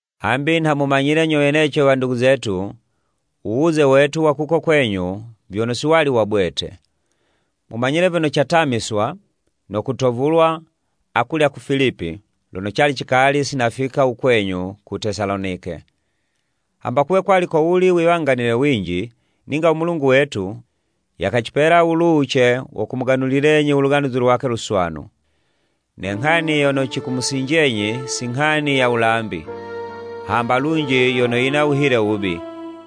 Hambi nha mumanyile nyo weneco wandugu zetu, u wuze wetu wa kuko kwenyu vyono si wali wa bwete. Mumanyile vyono catamiswa, no kutovulwa akulya ku Filipi, lono cali cikali si nafika u kwenyu ku Tesalonike. Hamba kuwe kwali kowuli wiwanganile winji, ninga u Mulungu wetu, yakacipela wuluwuce wo kumuganulilenyi u Luganuzi lwakwe Luswanu. Ne nghani yono cikumusinjenyi, si nghani ya wulambi, hamba lunji yono yina wuhile wubi,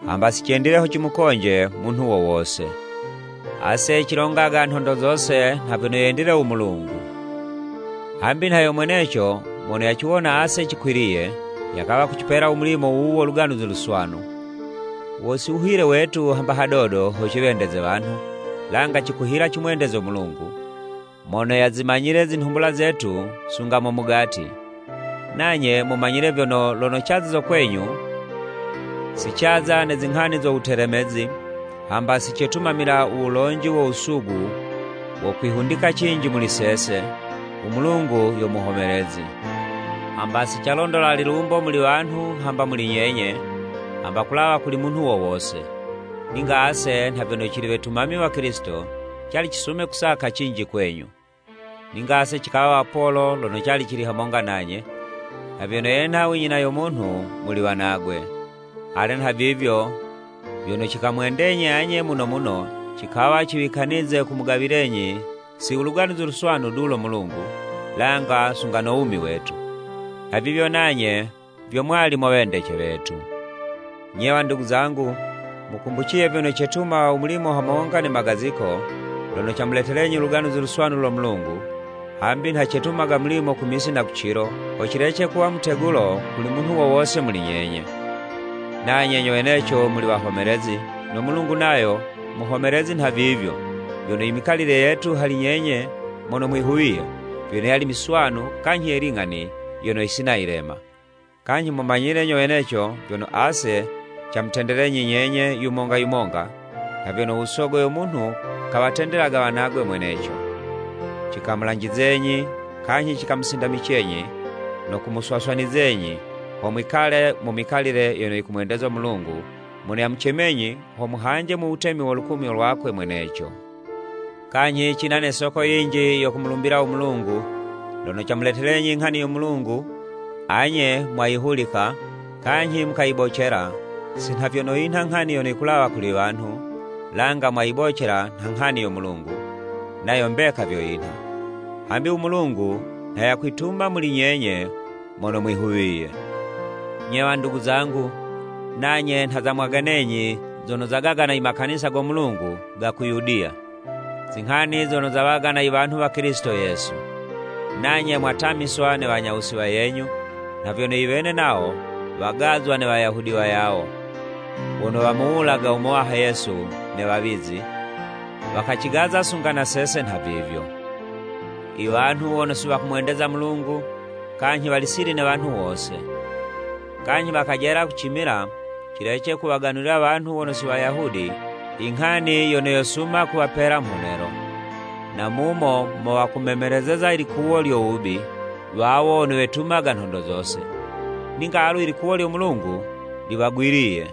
hamba si cendile ho cimukonje munhu wo wose. Ase cilongaga nhondo zose nha vyono yendile u Mulungu, hambi nha yo mweneco mono yaciwona ase cikwiliye, yakawa kucipela u mulimo wuwu wo Luganuzi Luswanu. Wo si wuhile wetu hamba hadodo ho ciwendeze wanhu, langa cikuhila kumwendeza u Mulungu, mono yazimanyile zinhumbula zetu sunga mo mugati. Nanye mumanyile vyono lono caziza kwenyu, si caza ne zinghani zo wutelemezi, hamba si cetumamila u wulonji wo wusugu wo kwihundika cinji muli sese, u Mulungu yo muhomelezi! Hamba si calondola lilumbo muli wanhu hamba muli nyenye, hamba kulawa kuli munhu wo wose, ninga ase nha vyono cili wetumami wa Kilisito, cali cisume kusaka cinji kwenyu. Ninga ase cikawa wapolo lono cali cili hamonga nanye, nha vyono yenha u nyina yo munhu muli wanagwe. Ale nhavivyo, vyono cikamwendenyi anye muno muno, cikawa ciwikanize kumugawilenyi si u Luganuzi Luswanu du lo Mulungu, langa sunga no wumi wetu. Nhavivyo nanye vyo mwali mo wendece wetu! Nye wandugu zangu, mukumbuciye vyono cetuma u mulimo hamonga ne magaziko. Lono camuletelenyi u Luganuzi Luswanu lo Mulungu, hambi nha cetumaga mulimo ku misi na ku cilo, ho cilece kuwa mutegulo kuli munhu wo wose muli nyenye. Nanye nyo weneco muli wahomelezi, no Mulungu nayo muhomelezi nha vivyo, vyono i mikalile yetu hali nyenye mono mwihuwiye, vyono yali miswanu kanyhi ye ling'ani yono yisina yilema. Kanyhi mumanyile nyo weneco vyono ase camutendelenyi nyenye yumonga yumonga, nha vyono u sogo yo munhu kawatendelega wanagwe mweneco. Cikamulanjizenyi, kanyhi cikamusindamicenyi, no kumuswaswanizenyi, ho mwikale mu mikalile yono yikumwendeza u Mulungu mono yamucemenyi ho muhanje u Wutemi no lukumyo lwakwe mweneco. Kanyhi cina ne soko yinji yo kumulumbila u Mulungu; lono camuletelenyi i nghani yo Mulungu, anye mwayihulika kanyhi mukayibocela si nha vyono yinha nghani yono yikulawa kuli wanhu, langa mwayibocela nha nghani yo Mulungu, nayo mbeka vyo yinha. Hambi u Mulungu nha yakwituma muli nyenye mono mwihuwiye. Nye wandugu zangu, nanye nha zamwaganenyi zono zagagana i Makanisa go Mulungu ga ku Yudiya, zinghani zono zawagana i wanhu wa Kilisito Yesu. Nanye mwatamiswa ne wanyawusi wayenyu, nha vyono iwene nawo wagazwa ne Wayahudi wayawo, wono wamuwulaga u Muwaha Yesu ne wawizi, wakacigaza sunga na sese nhavivyo. Iwanhu wono si wakumwendeza u Mulungu, kanyhi wali sili ne wanhu wose. Kanyhi wakajela kucimila cilece kuwaganulila wanhu wono si Wayahudi i nghani yono yosuma kuwapela mhonelo. Na mumo mo wakumemelezeza i liwalo lyo wubi wawo wono wetumaga nhondo zose. Ninga alu i likuwo lyo Mulungu liwagwiliye.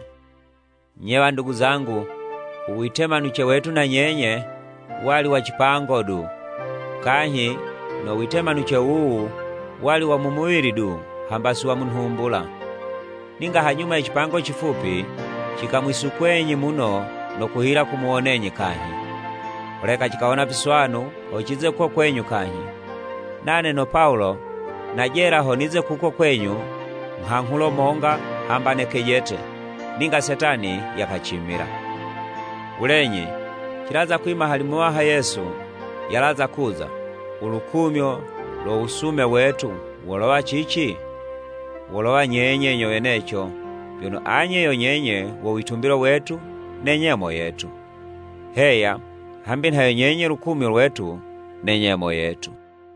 Nye wandugu zangu, u witemanuce wetu na nyenye, wali wa cipango du, kanyhi no witemanuce wuwu wali wa mu muwili du hamba si wa mu nhumbula. Ninga hanyuma ye cipango cifupi, cikamwisukwenyi muno no kuhila kumuwonenyi kanyhi! Holeka cikawona viswanu ho cize kuko kwenyu kanyhi. Nane no Pawulo najela ho nize kuko kwenyu nghanghulo monga hamba ne kejete, ninga Setani yakacimila. Wulenyi cilaza kwima hali Muwaha Yesu yalaza kuza, u lukumyo lo wusume wetu wolowa cici? Wolowa nyenye nyo weneco, vyono anye yo nyenye, wo witumbilo wetu ne nyemo yetu. Heya, hambi nha yo nyenye lukumyo lwetu ne nyemo yetu!